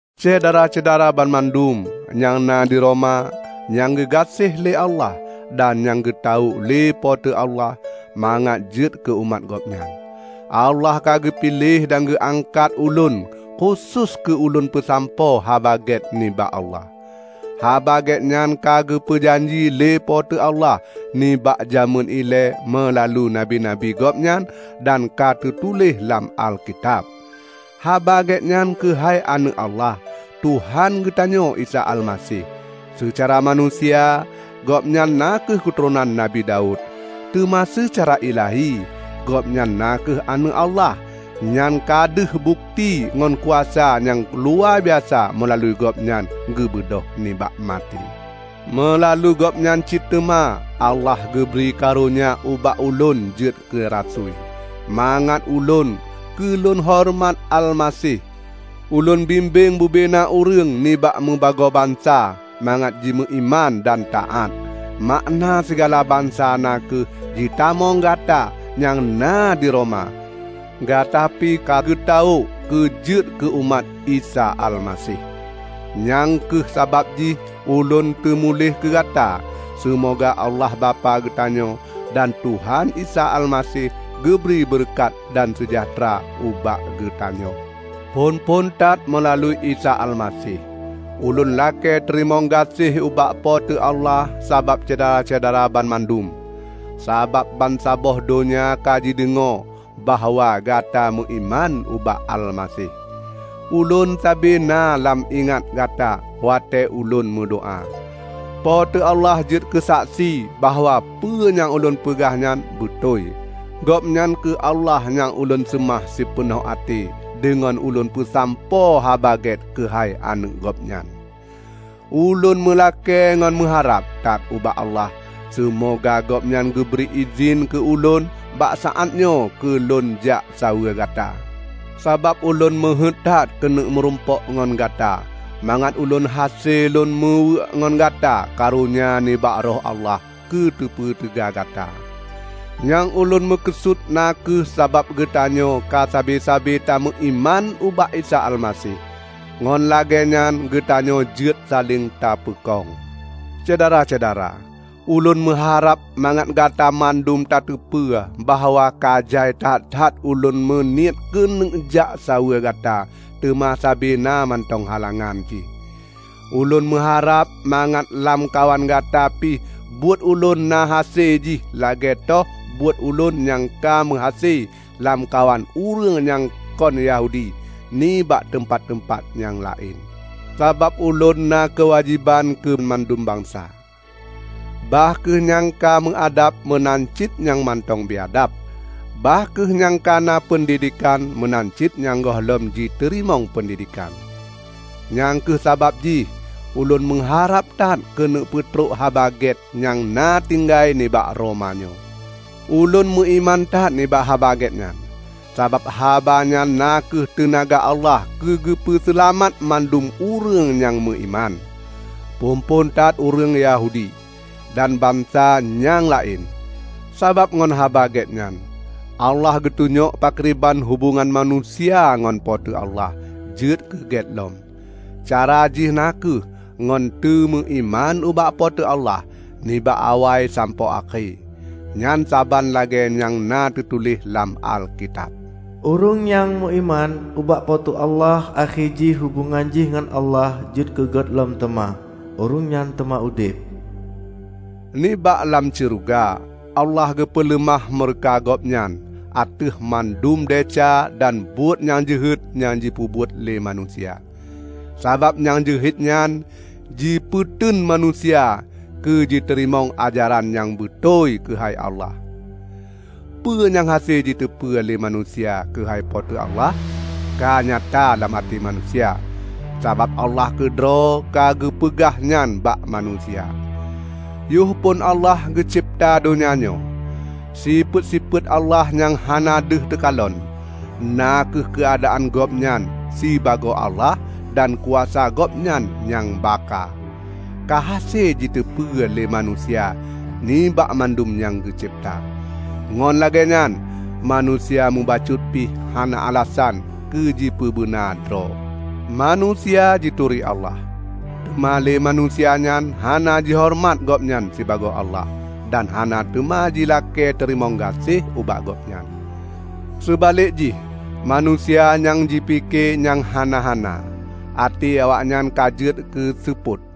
Syedara-syedara banmandum nyang na di Roma nyang geugaséh lé Allah dan nyang ka geutawök lé Po teu Allah mangat jeuet keu umat Gobnyan. Allah ka geupiléh dan geuangkat ulôn khusos keu ulôn peusampoe Haba Gét nibak Allah. Haba Gét nyan ka geupeu janji lé Po teu Allah nibak jamén ilée meulalu nabi-nabi Gobnyan dan ka teutuléh lam Alkitab. Haba Gét nyan keuhai Aneuëk Allah, Tuhan geutanyoe Isa Almaseh. Seucara manusia, Gobnyan na kheueh keuturonan Nabi Daud, teuma seucara ilahi Gobnyan na kheueh Aneuëk Allah. Nyan ka deuh bukeuti ngon kuasa nyang luwabiasa meulalu Gobnyan geubeudôh nibak maté. Meulalu Gobnyan cit teuma Allah geubri karonya ubak ulôn jeuet keu rasui, mangat ulôn -- keu lôn horeumat Almaseh -- ulôn bimbeng bubena ureuëng nibak meubagoe bansa mangat jimeuiman dan taát. Makna sigala bansa na kheueh jitamong gata nyang na di Roma; gata pi ka geutawök keu jeuet keu umat Isa Almaseh. Nyang kheueh sabab jih ulôn teumuléh keu gata. Seumoga Allah Bapak geutanyoe dan Tuhan Isa Almaseh geubri beureukat dan seujahteura ubak geutanyoe. Phon-phon that meulalu Isa Almaseh, ulôn lakée teurimong gaséh ubak Po teu Allah sabab Syedara-syedara banmandum; sabab bansaboh donya ka jideungoe bahwa gata meuiman ubak Almaseh. Ulôn sabe na lôn ingat gata watée ulôn meudoá. Po teu Allah jeuet keusaksi bahwa peue nyang ulôn peugah nyan beutôi. Gobnyan kheueh Allah nyang ulôn seumah sipeunoh até deungon ulôn peusampoe Haba Gét keuhai Aneuëk Gobnyan. Ulôn meulakée ngon meuharab that ubak Allah, seumoga Gobnyan geubri idhin keu ulôn bak saát nyoe keu lôn jak saweue gata. Sabab ulôn meuheuét that keuneuk meurumpok ngon gata mangat ulôn hase lôn meuweuek ngon gata karonya nibak Roh Allah keu teupeuteuga gata. Nyang ulôn meukeusut na kheueh sabab geutanyoe ka sabe-sabe tameuiman ubak Isa Almaseh, ngon lagée nyan geutanyoe jeuet saléng tapeukong. Syedara-syedara! Ulôn meuharab mangat gata mandum tateupeue bahwa ka jai that-that ulôn meuniet keuneuk jak saweue gata teuma sabe na mantong halangan jih. Ulôn meuharab mangat lamkawan gata pih buet ulôn na hase jih lagée toh buet ulôn nyang ka meuhase lamkawan ureuëng nyang kon Yahudi nibak teumpat-teumpat nyang laén. Sabab ulôn na keuwajéban keu mandum bansa; bah kheueh nyang ka meuadab meunan cit nyang mantong biadab, bah kheueh nyang ka na peundidekan meunan cit nyang gohlom jiteurimong peundidekan. Nyang kheueh sabab jih ulôn meuharab that keuneuk peutrok Haba Gét nyang na tinggai nibak Roma nyoe. Ulôn meuiman that nibak Haba Gét nyan, sabab haba nyan na kheueh teunaga Allah keu geupeue seulamat mandum ureuëng nyang meuiman; phon-phon that ureuëng Yahudi, dan bansa nyang laén. Sabab ngon Haba Gét nyan Allah geutunyok pakriban hubongan manusia ngon Po teu Allah jeuet keu gét lom; cara jih na kheueh ngon teumeuiman ubak Po teu Allah, nibak awai sampoe akhé. Nyan saban lagée nyang na teutuléh lam Alkitab, "Ureuëng nyang meuiman ubak Po teu Allah akhé jih hubongan jih ngon Allah jeuet keu gét lom teuma, ureuëng nyan teuma udeb!" Nibak lam syeuruga Allah geupeuleumah meureuka Gobnyan ateueh mandum desya dan buet nyang jeuhet nyang jipeubuet lé manusia, sabab nyang jeuhet nyan jipeuteun manusia keu jiteurimong ajaran nyang beutôi keuhai Allah. Peue nyang hase jiteupeue lé manusia keuhai Po teu Allah ka nyata lam até manusia, sabab Allah keudroe ka geupeugah nyan bak manusia. Yoh phon Allah geucebta donya nyoe, sifeuet-sifeuet Allah nyang hana deuh teukalon, na kheueh keuadaan Gobnyan sibagoe Allah dan kuasa Gobnyan nyang bakha, ka hase jiteupeue lé manusia nibak mandum nyang geucebta. Ngon lagée nyan manusia mubacut pih hana alasan keu jipeubeuna droe. Manusia jituri Allah, teuma lé manusia nyan hana jihoreumat Gobnyan sibagoe Allah dan hana teuma jilakée teurimong gaséh ubak Gobnyan. Seubalek jih manusia nyang jipike nyang hana-hana; até awaknyan ka jeuet keuseupôt.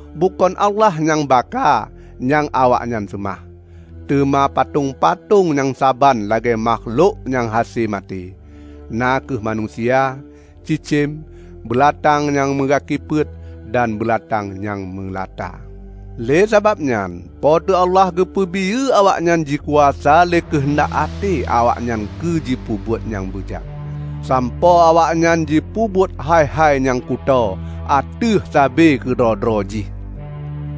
Bukon Allah nyang bakha nyang awaknyan seumah, teuma patong-patong nyang saban lagée makhlok nyang hase maté; na kheueh manusia, cicém, beulatang nyang meugaki peuet, dan beulatang nyang meulata. Le sababnyan Po teu Allah geupeubiyeu awaknyan jikuasa lé keuheundak até awaknyan keu jipeubuet nyang beujat, sampoe awaknyan jipeubuet hai-hai nyang kutoe ateueh sabe keudroe-droe jih.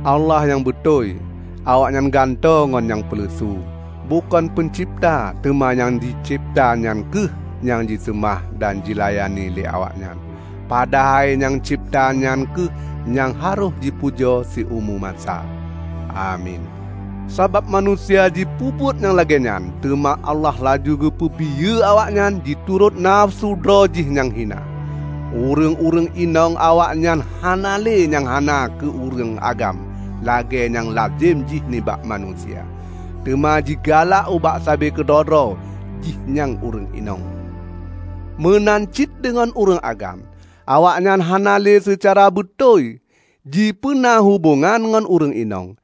Allah nyang beutôi, awaknyan gantoe ngon nyang peuleusu. Bukon peuncebta teuma nyang jicebta nyan kheueh nyang jiseumah dan jilayani lé awaknyan. Padahai nyang cebta nyan kheueh nyang harôh jipujoe siumu masa! Amin. Sabab manusia jipeubuet nyang lagée nyan, teuma Allah laju geupeubiyeu awaknyan jiturot nafeusu droe jih nyang hina. Ureuëng-ureuëng inong awaknyan hana le nyang hawa keu ureuëng agam lagée nyang lazem jih nibak manusia, teuma jigalak ubak sabe keudroe-droe jih nyang ureuëng inong. Meunan cit deungon ureuëng agam; awaknyan hana le seucara beutôi jipeuna hubongan ngon ureuëng inong,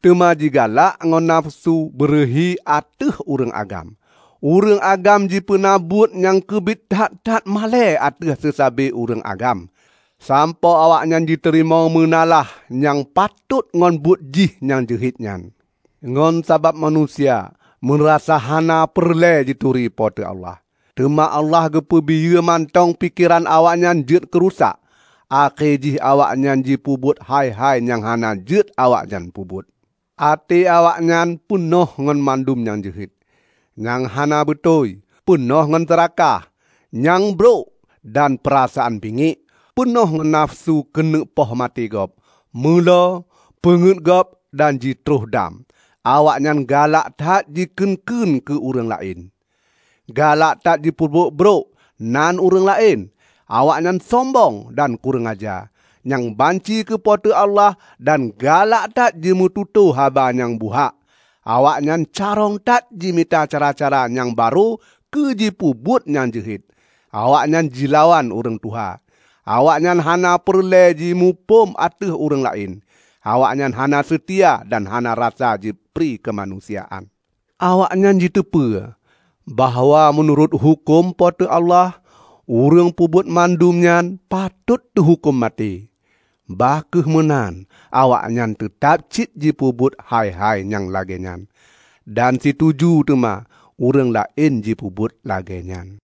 teuma jigalak ngon nafeusu beureuhi ateueh ureuëng agam. Ureuëng agam jipeuna buet nyang keubiet that-that malée ateueh seusabe ureuëng agam, sampoe awaknyan jiteurimong meunalah nyang patot ngon buet jih nyang jeuhet nyan. Ngon sabab manusia meurasa hana peureulée jituri Po teu Allah, teuma Allah geupeubiyeu mantong pikeran awaknyan jeuet keurusak, akhé jih awaknyan jipeubuet hai-hai nyang hana jeuet awaknyan peubuet. Até awaknyan peunoh ngon mandum nyang jeuhet, nyang hana beutôi; peunoh ngon seurakah, nyang brok dan peurasaan bingiek; peunoh ngon nafeusu keuneuk poh maté gob, meulo, peungeuet gob dan jitroh dam. Awaknyan galak that jikheun-kheun keu ureuëng laén, galak that jipeubrok-brok nan ureuëng laén; awaknyan sombong dan kureueng aja, nyang banci keu Po teu Allah dan galak that jimeututoe haba nyang buhak. Awaknyan carông that jimita cara-cara nyang barô keu jipeubuet nyang jeuhet. Awaknyan jilawan ureuëng tuha; awaknyan hana peureulée jimuphom ateueh ureuëng laén; awaknyan hana seutia dan hana rasa prikeumanusiaan. Awaknyan jiteupeue, bahwa meunurot huköm Po teu Allah, ureuëng peubuet mandum nyan patot teuhuköm maté. Bah kheueh meunan awaknyan teutab cit jipeubuet hai-hai nyang lagée nyan; dan situju teuma ureuëng laén jipeubuet lagée nyan.